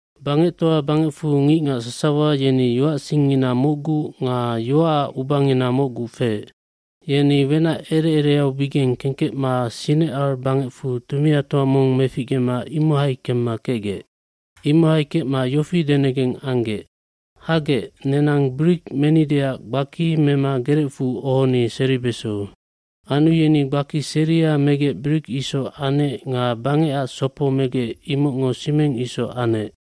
Bangectoa bangecfu ngicngac sasawa yeni yoacsingngina mocgu nga yoaac ubangina mocgu feec. Yeni wenac ere ereaubigeng kengkecma Sinecar bangecfu tumiatoa mong meficgema imohai kemma kecgec. Imohai kecma yofi denegeng anggec, “Hagec, nenang brik menideac gbaki mema gerecfu ohoni seribeso.” Anu yeni gbaki seria megec brik isoca anec nga bangecac sopob megec imocngo simeng isoc anec.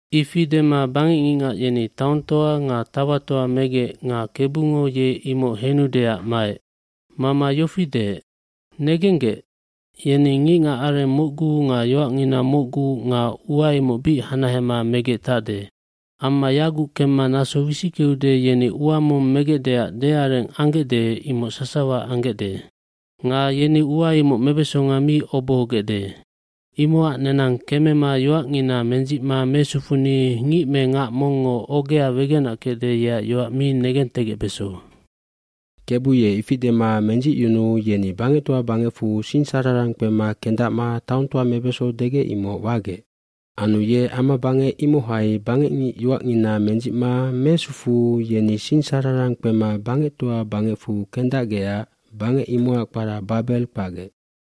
Ifi dema bangecngicngac yeni taongtoa nga tauatoa megec nga Kebu ye imoc henudeac maec. Mama yofi deec, “Negenggec, yeni ngicngacareng mocgu nga yoacngina mocgu nga ua imoc bic hanahema megec tacde. Amma yaguc kemma naso wisickeude yeni ua mong megecdeac deareng anggecde imoc sasawa anggecde. Nga yeni ua imoc mebesonga mi obohogecde nga obohobesandae. Imocac nenang kemema yoacngina mendzicma mesufuni ngic me ngac mongngo ogea wegenac kecde yeac yoac mi negentegecbeso.” Kebu ye ifi dema mendzicyunuu yeni bangectoa bangecfu singsararang kpema kendacma taongtoa mebeso degec imoc wagec. Anu ye amabangec imohai bangecngic yoacngina medzicma mesufuu yeni singsararang kpema bangectoa bangecfu kendacgecac bangec imocac kpara Babeld kpacgec.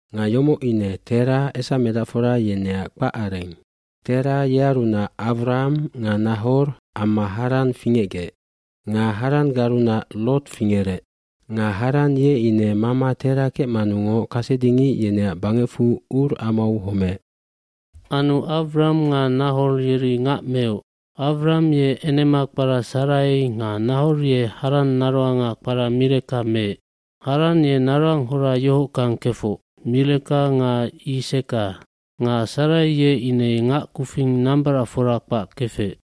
Nga yomoc ine Tera esamedacfora yeneac kpacareng. Tera yearunac Awram nga Nahor amma Haran fingecgec. Nga Haranggarunac Lot fingerec. Nga Haran ye ine mama Tera kecmanungoc kasedingic yeneac bangecfu Ur amau homeec. Anu Awram nga Nahor yeri ngac meoc. Awram ye enema kpara Sarai nga Nahor ye Haran naroanga kpara Mileka meec. Haran ye naroanghora yohockang kefoc, Mileka nga Yiseka. gNga Sarai ye ine ngac kufing nambaracfora kpac kefec.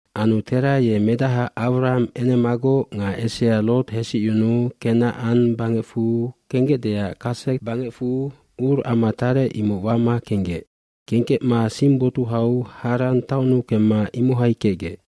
iAnu Tera ye medaha Awram enemagoc nga esea Loth hesicyunuu Kenacan bangecfu kenggecdeac Kased bangecfu Ur ama tarec imoc wama kenggec. Kengkecma sing botuhau Haran taonnu kemma imohai kecgec.